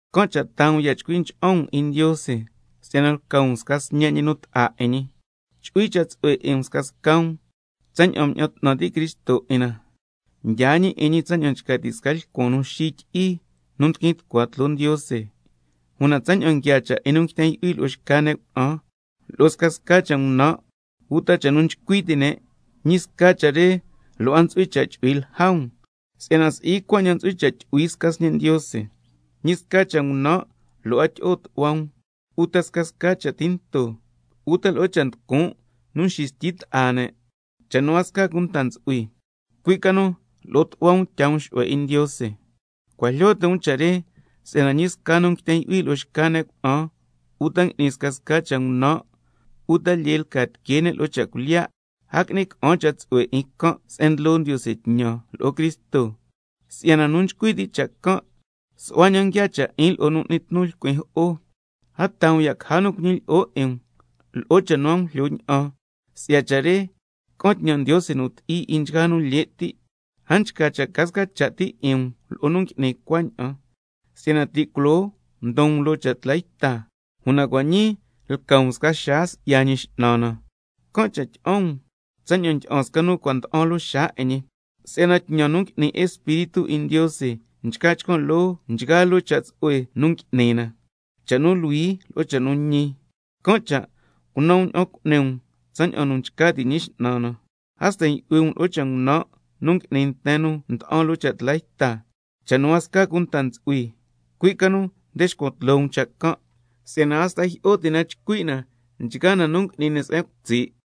Can' cha' taa um ya' chcui ncha'an um 'in Ndiose si'yana lca um sca sñe' ñi nu ta'a 'in ñi. Chu'hui cha' tsu'hue 'in um scasca um tsaña'an mña'an 'tnan ti' Cristo 'in na, mdyaa ñi 'in ñi tsaña'an nchca ti' sca lcuan nu xityi'i nu ndiquin tucua tloo Ndiose. Una tsaña'an nguiaa cha' 'in nu nguiten yu'hui lo'o xca ne' cuna'an, lo'o scasca cha' ngunan', uta cha' nu nchcui ti' ne', ñi sca cha' re lo' a ntsu'hui cha' chu'hui lja um, si'yana si'i cuaña'an ntsu'hui cha' tyu'hui sca sñe' Ndiose. Ñi sca cha' ngunan' lo' a tyi'o tu'hua um, uta scasca cha' tinto, uta lo'o cha' nducun' nu nxistyi ta'a ne', cha' nu a sca cunta ntsu'hui, cui' ca nu lo'o tu'hua um tyaa um xu'hue 'in Ndiose. Cua' jlyo ti' um cha' re, si'yana ñi sca nu nguiten yu'hui lo'o xca ne' cuna'an, uta ngui'ni scasca cha' ngunan', uta lyee lca tiquee ne' lo'o cha' cuilyiya', a qui'ni ca'an cha' tsu'hue 'in can' se'en ndlo Ndiose tñan lo'o Cristo, si'yana nu nchcui ti' cha' can' su'hua ña'an nguiaa cha' 'in lo'o nu n'ni tnu lcuin jo'o. A taa um ya' caja nu cuñilyi'o 'in um lo'o cha' nu a jlyo ña'an, si'ya cha' re ca'an tñan Ndiose nu ti'i 'in nchgaa nu lye' ti'. Can' cha' a nchca cha' ca sca cha' ti 'in um lo'o nu ngui'ni cuaña'an. Si'yana nu ncua ti' culoo mdon um loo cha' tla yta, una cua' ñii lca um sca xaa si'ya Ñi X'nan na, can' cha' tyi'an um tsaña'an ndyi'an sca nu cua' nda'an loo xaa 'in ñi, (si'yana tñan nu ngui'ni Espíritu 'in Ndiose nchca chcan' loo nchgaa loo cha' tsu'hue nu ngui'ni na, cha' nu luhui lo'o cha' nu ñi), can' cha' cunan um ña'an nu cu'ni um tsaña'an nu nchca ti' Ñi X'nan na. A sten yu'hui um loo cha' ngunan' nu ngui'ni nten nu nda'an lo'o cha' tla yta 'in, cha' nu a sca cunta ntsu'hui, cui' ca nu nde xcuan tloo um cha' can', si'yana hasta jyi'o ti' na chcui' na nchgaa cha' nu ngui'ni ne' se'en cutsi' ti.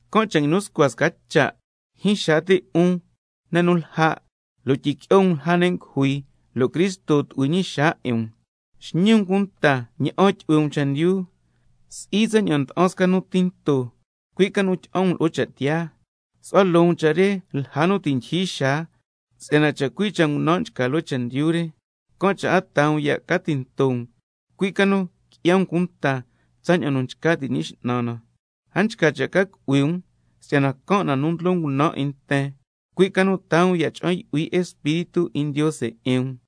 Can' cha' nguinu scua sca cha': Jyin xaa ti' 'un ne' nu lja', lo' tyiqui'o um lja ne' ngujui, lo' Cristo tu'hui ñi xaa 'in um. Xñi tsu'hue um cunta ña'an tyu'hui um chendyu, si'i tsaña'an nda'an sca nu tinto, cui' ca nu tyi'an um lo'o cha' tiyaa, su'hua loo um cha' re lja nu ti' ndyijyi xaa, si'yana chacui' cha' ngunan' nchca loo chendyu re. Can' cha' a taa um ya' ca tinto um, cui' ca nu qui'ya um cunta tsaña'an nu nchca ti' Ñi X'nan na. A nchca cha' ca cu'hui um, si'yana can' cha' nu ndlo ngunan' 'in nten, cui' ca nu taa um ya' cha'an yu'hui Espíritu 'in Ndiose 'in um,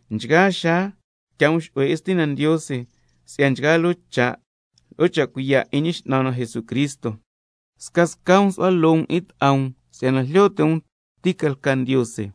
nchgaa xaa tyaa um xu'hue 'in Stina Ndiose si'ya nchgaa loo cha', lo'o cha' cuiya' 'in Ñi X'nan na Jesucristo. Scasca um su'hua loo um 'in ta'a um si'yana jlyo ti' um ti ca lca Ndiose.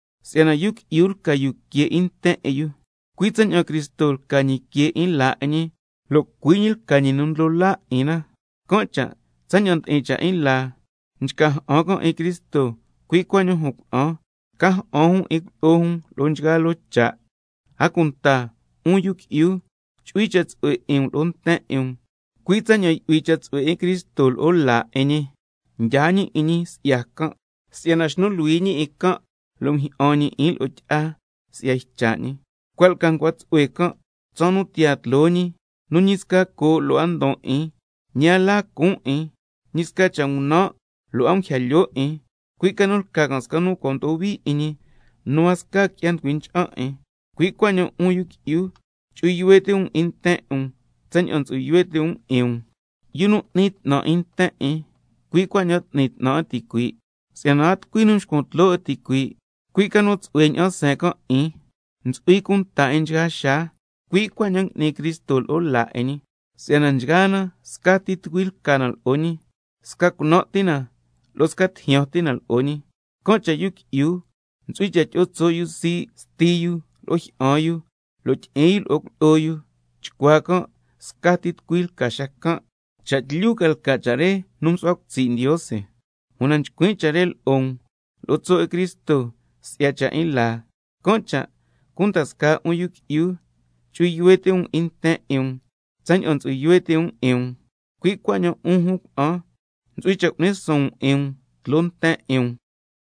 Si'yana yu qui'yu lca yu que 'in nten 'in yu, cui' tsaña'an Cristo lca ñi que 'in laa 'in ñi, lo' cui' ñi lca ñi nu Ndlo Laa 'in na. Can' cha' tsaña'an ndi'in cha' 'in laa, nchca ja'an can' 'in Cristo, cui' cuaña'an jun cuna'an ntsu'hui cha' ca ja'an jun 'in cuilyi'o jun lo'o nchgaa loo cha'. A cunta 'un yu qui'yu, chu'hui cha' tsu'hue 'in um lo'o nten 'in um, cui' tsaña'an yu'hui cha' tsu'hue 'in Cristo lo'o laa 'in ñi, mdyaa ñi 'in ñi si'ya can', si'yana xnu luhui ñi 'in can' xa mjyi'an ñi 'in lo'o tyi'a si'ya cha' nu nchcui' ñi, cua' lca ncua tsu'hue can' tsaan nu tiyaa tloo ñi, nu ñi sca coo' lo' a ndon 'in, ñi a la cuun' 'in, ñi sca cha' ngunan' lo' a nguija lyoo 'in, cui' ca nu lca can' sca nu cua' mdo'o hui 'in ñi nu a sca qui'ya nducui ncha'an 'in. Cui' cuaña'an 'un yu qui'yu, chu'hui yuhue ti' um 'in nten 'in um tsaña'an ntsu'hui yuhue ti' um 'in um. Yu nu n'ni 'tnan 'in nten 'in, cui' cuaña'an n'ni 'tnan 'in ticuii'. Si'yana a tucui nu nxcuan tloo 'in ticuii', cui' ca nu tsu'hue ña'an seen can' 'in, ntsu'hui cunta 'in nchgaa xaa, cui' cuaña'an ngui'ni Cristo lo'o laa 'in ñi, si'yana nchgaa na scati tucui lca na lo'o ñi, sca cunan' ti na lo' sca tijyan ti na lo'o ñi. —Can' cha' yu qui'yu ntsu'hui cha' tyi'o tso' yu sii' sti yu lo'o jyi'an yu, lo' tyi'in yu lo'o cuilyi'o yu, chcuaa can' sca tucui ti ca xacan'—. Cha' tlyu ca lca cha' re nu msu'hua cutsi' Ndiose, una nchcuin' cha' re lo'o um lo'o tso' 'in Cristo si'ya cha' 'in laa. Can' cha' cunda scaa 'un yu qui'yu, chu'hui yuhue ti' um 'in nten 'in um tsaña'an ntsu'hui yuhue ti' um 'in um, cui' cuaña'an 'un jun cuna'an ntsu'hui cha' cu'ni suun um 'in um tloo nten 'in um.